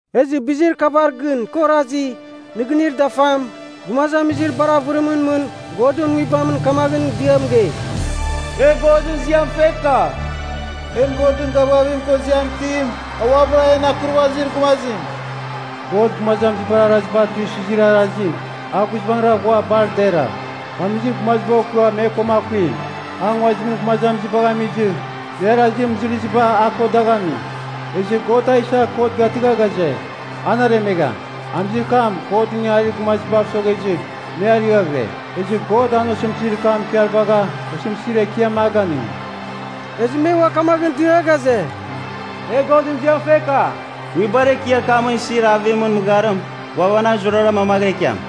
Ezɨ bizir kabar gɨn kɨ orazi, nɨgɨnir dafam, gumazamizir bar avɨrimɨn mɨn Godɨn Nguibamɨn kamaghɨn dia mɨgei, “E Godɨn ziam feka! En Godɨn gavgavim ko ziam itim, a uabɨra en Akurvazir Gumazim! God gumazamizibar araziba tuisɨzir arazim, a guizbangɨra ghua bar dera! Amizir gumaziba okɨa me ko akuim, a nguazimɨn gumazamizibagh amizɨ me arazir mɨzɨrɨziba a ko dagh ami, ezɨ God a isa kot gatɨgha ghaze, an aremegham. Amizir kam Godɨn ingangarir gumazibav soghezɨ me ariaghɨre, ezɨ God an osɨmtɨzir kam ikarvagha osɨmtɨzir ekiam a ganɨngi.” Ezɨ me ua kamaghɨn dia ghaze, “E Godɨn ziam feka! Nguibar ekiar kamɨn isir avimɨn mɨgharim ghuavanang zurara mamaghɨra ikiam!”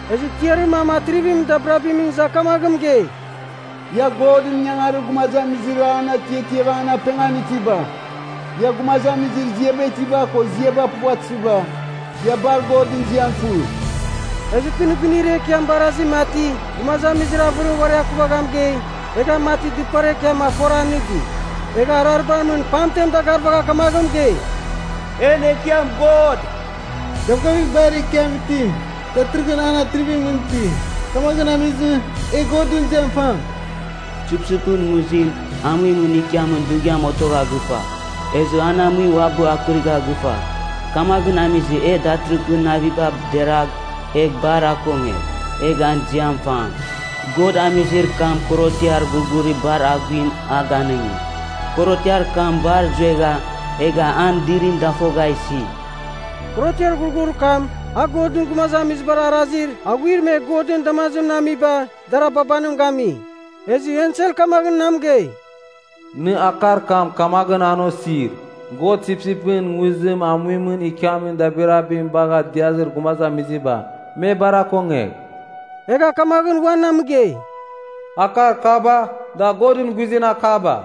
Ezɨ tiarir mam atrivimɨn dabirabimɨn iza kamaghɨn mɨgei, “Ia Godɨn ingangarir gumazamizir an atiatiava an apengan itiba, ia gumazamizir ziaba itiba ko ziaba puvatɨziba, ia bar Godɨn ziam fɨ!” Ezɨ kɨ nɨgɨnir ekiam barazi mati gumazamizir avɨrim uari akuvagha mɨgei, egha mati dɨpar ekiam afora nɨdi. Egha araribar mɨn pamten dagarvagha kamaghɨn mɨgei, “En Ekiam God, Gavgavir Bar Ekiam Itim, datɨrɨghɨn an atrivimɨn iti. Kamaghɨn amizɨ, e Godɨn ziam fam! Sipsipɨn nguzim amuimɨn ikiamin dughiam otogha gɨfa, ezɨ an amuim uabɨ akɨrigha gɨfa. Kamaghɨn amizɨ e datɨrɨghɨn naviba deragh egh bar akongegh, egh an ziam fam! God amizir kam korotiar ghurghurir bar aghuim a ganɨngi, korotiar kam bar zuegha egha an dirim dafogha isi.” (Korotiar ghurghurir kam, a Godɨn gumazamizibar arazir aghuir me Godɨn damazimɨn amiba, dar ababanim gami.) Ezɨ ensel kamaghɨn na mɨgei, “Nɨ akar kam kamaghɨn an osir: God sipsipɨn nguzim amuimɨn ikiamin dabirabim bagha diazir gumazamiziba, me bar akongegh!” Egha kamaghɨn ua na mɨgei, “Akar kaba, da Godɨn guizɨn akaba.”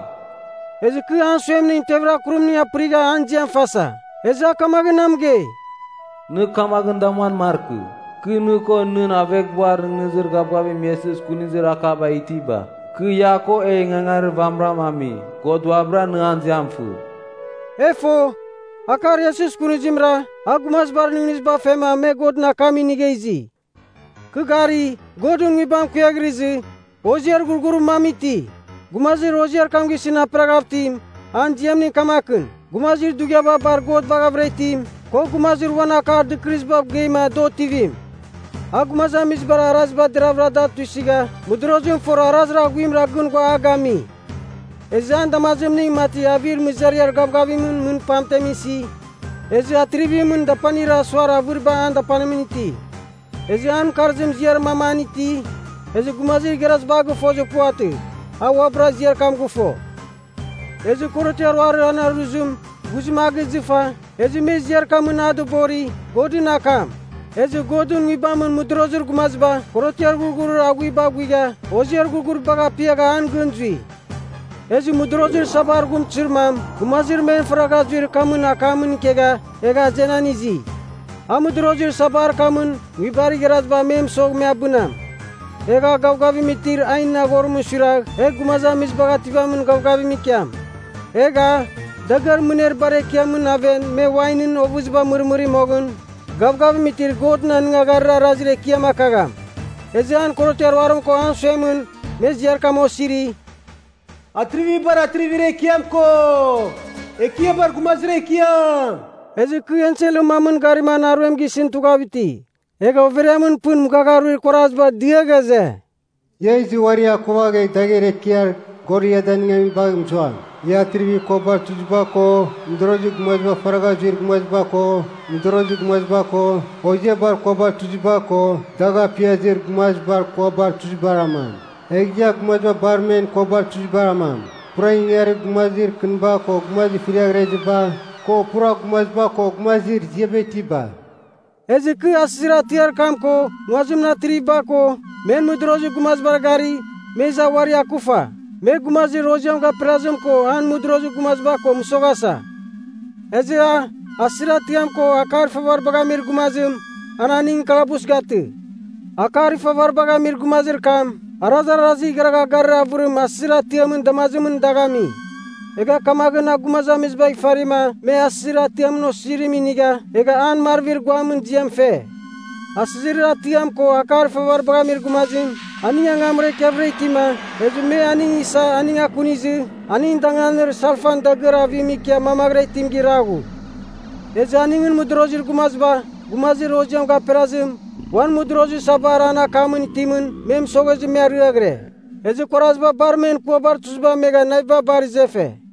Ezɨ kɨ an suemningɨn tevir akurimning apɨrigha an ziam fasa. Ezɨ a kamaghɨn na mɨgei, “Nɨ kamaghɨn damuan markɨ! Kɨ, nɨ ko nɨn aveghbuar nɨghnɨzir gavgavim Iesus kunizir akabar itiba, kɨ ia ko e ingangarir vamɨram ami. God uabɨra, nɨ an ziam fɨ.” E fo, akar Iesus kunizimra, a gumazibar nɨghnɨziba fema me Godɨn akam inigha izi. Kɨ gari, Godɨn Nguibam kuiaghrɨzɨ, hoziar ghurghurir mam iti. Gumazir hoziar kam gisɨn aperaghav itim, an ziamning kamakɨn, “Gumazir dughiaba bar God baghavɨra itim,” ko “Gumazir uan akar dɨkɨrɨziba mɨgeima da otivim.” A gumazamizibar araziba deravɨra da tuisɨgha mɨdorozim fora arazir aghuimra gɨn ghua a gami. Ezɨ an damazimning mati avir mɨzariar gavgavimɨn mɨn pamtem isi, ezɨ atrivimɨn dapanir asuar avɨriba an dapanimɨn iti. Ezɨ an mɨkarzim ziar mam an iti, ezɨ gumazir igharaziba a gɨfozir puvatɨ. A uabɨra ziar kam gɨfo. Ezɨ korotiar ruarir an aruzim, ghuzim a gizɨfa, ezɨ me ziar kamɨn a dɨbori, “Godɨn akam.” Ezɨ Godɨn Nguibamɨn mɨdorozir gumaziba korotiar ghurghurir aghuiba aghuigha hoziar ghurghuribagh apiagha an gɨn zui. Ezɨ mɨdorozir sabar ghumtɨzir mam gumazir men faragha zuir kamɨn akamɨn ikegha, egha azenan izi. A mɨdorozir sabar kamɨn nguibar igharaziba me mɨsogh me abɨnam. Egh a gavgavim itir ainɨn aghorimɨn suiragh egh gumazamizibagh ativamin gavgavim ikiam. Egh a, dagɨar mɨner bar ekiamɨn aven me wainɨn ovɨziba mɨrmɨri moghɨn, gavgavim itir Godɨn anɨngagharir arazir ekiam akagham. Ezɨ an korotiar ruarim ko an suemɨn, me ziar kam osiri, “Atrivibar Atrivir Ekiam ko, Ekiabar Gumazir Ekiam.” Ezɨ kɨ enselɨn mamɨn garima an aruem gisɨn tughav iti. Egha overiamɨn pɨn mɨghagha aruir kuarazibar dia ghaze, “Ia izɨ uari akuvagh egh dagher ekiar God ia danɨngamim bagh mɨzuam. Ia atrivibar kuabar tuziba ko, mɨdorozir gumazibar faragha zuir gumaziba ko mɨdorozir gumaziba ko, hoziabar kuabar tuziba ko dagh apiazir gumazibar kuabar tuzibar amam. Egh ia gumaziba bar men kuabar tuzibar amam, pura ingangarir gumazir kɨniba ko gumazir fɨriaghreziba, ko pura gumaziba ko gumazir ziaba itiba!” Ezɨ kɨ asɨzir atiar kam ko nguazimɨn atriviba ko, men mɨdorozir gumazibar gari, me iza uari akufa. Me gumazir hoziam gaperazim ko an mɨdorozir gumaziba ko mɨsoghasa. Ezɨ a, asɨzir atiam ko akar ifavaribagh amir gumazim, an aning kalabus gatɨ. Akar ifavaribagh amir gumazir kam arazarazir igharagha garir avɨrim asɨzir atiamɨn damazimɨn dagh ami. Egha kamaghɨn a gumazamizibagh ifarima me asɨzir atiamɨn osizirim inigha egha an marvir guamɨn ziam fe. Asɨzir atiam ko akar ifavaribagh amir gumazim, aning angamra ikiavɨra itima, ezɨ me aning isa aning akunizɨ aning danganir salfan dagɨar avim ikia mamaghɨra itim giraghu. Ezɨ aningɨn mɨdorozir gumaziba, gumazir hoziam gaperazim, uan mɨdorozir sabar an akamɨn itimɨn me mɨsoghezɨ me ariaghɨre. Ezɨ kuaraziba bar men kuabar tuziba amegha naviba bar izefe.